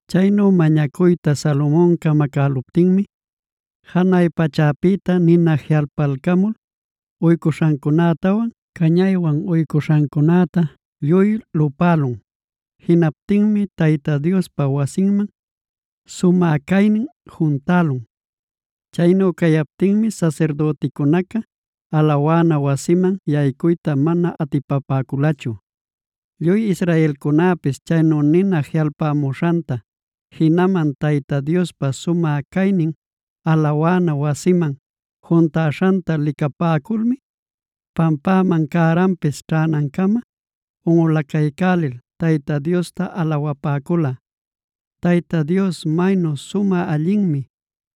Chaynu mañacuyta Salomon camacäluptinmi, janay pachäpïta nina jiꞌalpalcamul uycuśhancunätawan cañaywan uycuśhancunätaa lluy lupälun. Jinaptinmi Tayta Diospa wasinman sumä caynin juntälun. Chaynu cayaptinmi sasirdüticunaca alawana wasiman yaycuyta mana atipapäculachu. Lluy israelcunäpis chaynu nina jiꞌalpamuśhanta, jinaman Tayta Diospa sumä caynin alawana wasiman juntaśhanta licapäculmi, pampäman cäranpis ćhänancama unꞌulacaycälil Tayta Diosta alawapäcula: “Tayta Dios maynu sumä allinmi;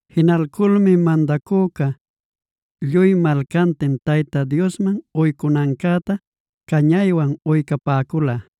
Jinalculmi mandacüca lluy malcantin, Tayta Diosman uycunancäta cañaywan uycapäcula.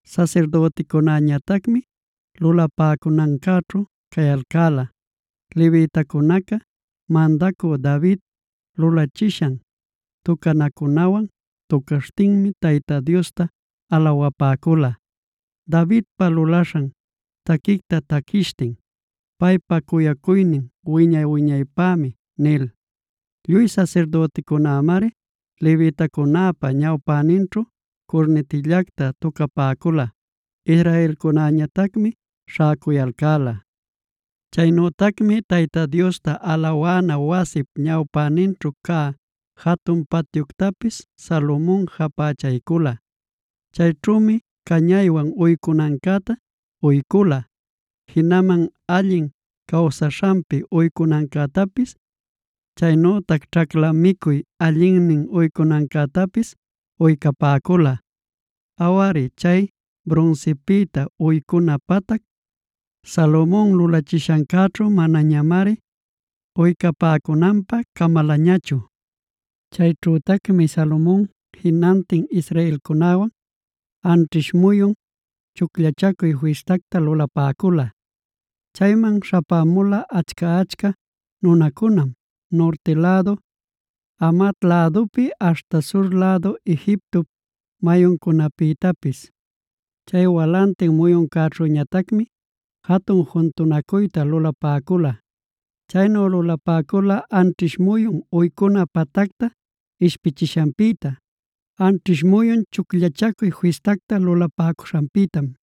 Sasirdüticunäñatacmi lulapäcunancäćhu cayalcäla. Levitacunacá mandacü David lulachishan tucanacunawan tucaśhtinmi Tayta Diosta alawapäcula, Davidpa lulaśhan taquicta taquishtin: “Paypa cuyacuynin wiña-wiñaypämi” nil. Lluy sasirdüticunämari levitacunäpa ñawpäninćhu curnitillacta tucapäcula; israelcunäñatacmi śhäcuyalcäla. Chaynütacmi Tayta Diosta alawana wasip ñawpäninćhu cä jatun patyuctapis Salomon japächaycula. Chayćhümi cañaywan uycunancäta uycula, jinaman allin cawsaśhanpi uycunancätapis, chaynütac ćhacla micuy allinnin uycunancätapis uycapäcula. Awari chay brunsipïta uycuna patac, Salomon lulachishancäćhu manañamari uycapäcunanpä camalañachu. Chayćhütacmi Salomon jinantin israelcunäwan anćhish muyun Chucllachacuy Fistacta lulapäcula. Chayman śhapämula achca-achca nunacunam, nurti lädu Hamat lädupi aśhta sur lädu Egiptop mayuncunapïtapis. Chay walantin muyuncäćhüñatacmi jatun juntunacuyta lulapäcula. Chaynu lulapäcula anćhish muyun uycuna patacta ishpichishanpïta, anćhish muyun Chucllachacuy Fistacta lulapäcuśhanpïtam.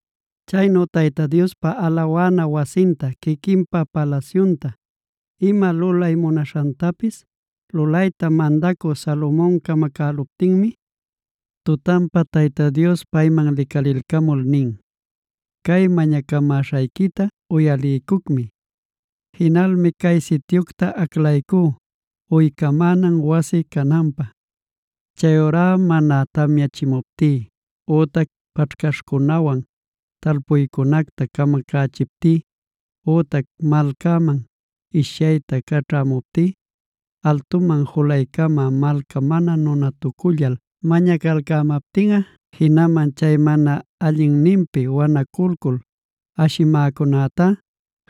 Chaynu Tayta Diospa alawana wasinta, quiquinpa palasyunta, ima lulay munaśhantapis lulayta mandacü Salomon camacäluptinmi, tutanpa Tayta Dios payman licalilcamul nin: “Cay mañacamäśhayquita uyaliycucmi. Jinalmi cay sityucta aclaycú uycamänan wasi cananpä. Chayurá mana tamyachimuptí ütac paćhcaśhcunäwan talpuycunacta camacachiptí ütac malcäman ishyayta caćhamuptí, altuman julaycamä malcá mana nunatucullal mañacalcämaptinꞌa jinaman chay mana allinninpi wanaculcul ashimäcunätá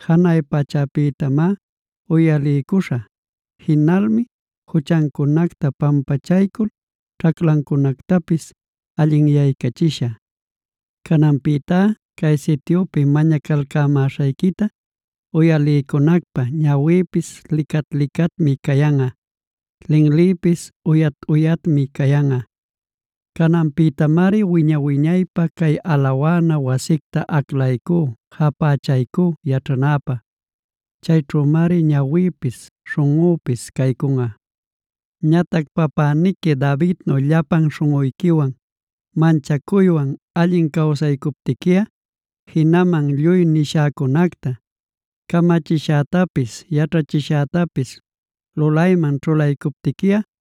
janay pachäpïtamá uyaliycuśhä. Jinalmi juchancunacta pampachaycul ćhaclancunactapis allinyaycachishä. “Cananpïtá cay sityupi mañacalcämäśhayquita uyaliycunacpä ñawïpis licat-licatmi cayanꞌa, linlïpis uyat-uyatmi cayanꞌa. Cananpïtamari wiña-wiñaypä cay alawana wasicta aclaycú, japächaycú yaćhanäpä. Cayćhümari ñawïpis śhunꞌüpis caycunꞌa. “Ñatac papäniqui Davidnu llapan śhunꞌuyquiwan, manchacuywan allin cawsaycuptiquiꞌa, jinaman lluy nishäcunacta, camachishätapis, yaćhachishätapis lulayman ćhulaycuptiquiꞌa,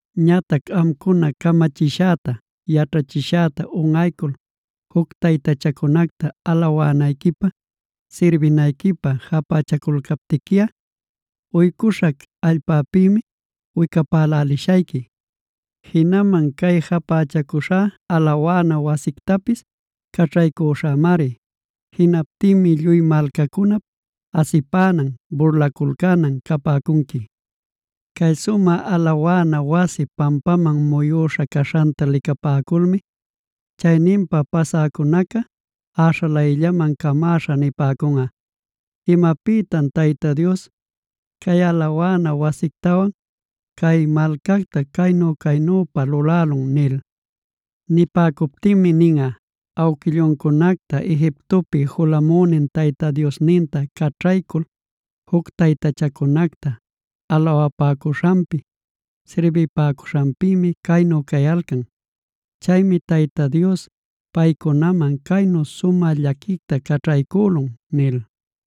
“Ñatac amcuna camachishäta, yaćhachishäta unꞌaycul juc taytachacunacta, alawanayquipä, sirbinayquipä japächaculcaptiquiꞌa, uycuśhac allpäpïmi wicapälälishayqui. Jinaman cay japächacuśhá alawana wasictapis caćhaycüśhämari. Jinaptinmi lluy malcacunap asipänan, burlaculcänan capäcunqui. Cay sumä alawana wasi pampaman muyüśha caśhanta licapäculmi, chayninpa pasäcunaca äśhalayllaman camäśha nipäcunꞌa: ‘¿Imapïtan Tayta Dios, cay alawana wasictawan cay malcacta caynü-caynüpa lulälun?’ nil. Nipäcuptinmi ninꞌa: ‘Awquilluncunacta Egiptopi julamünin Tayta Diosninta caćhaycul juc taytachacunacta alawapäcuśhanpi, sirbipäcuśhanpïmi caynu cayalcan. Chaymi Tayta Dios paycunaman caynu sumä llaquicta caćhaycülun’” nil.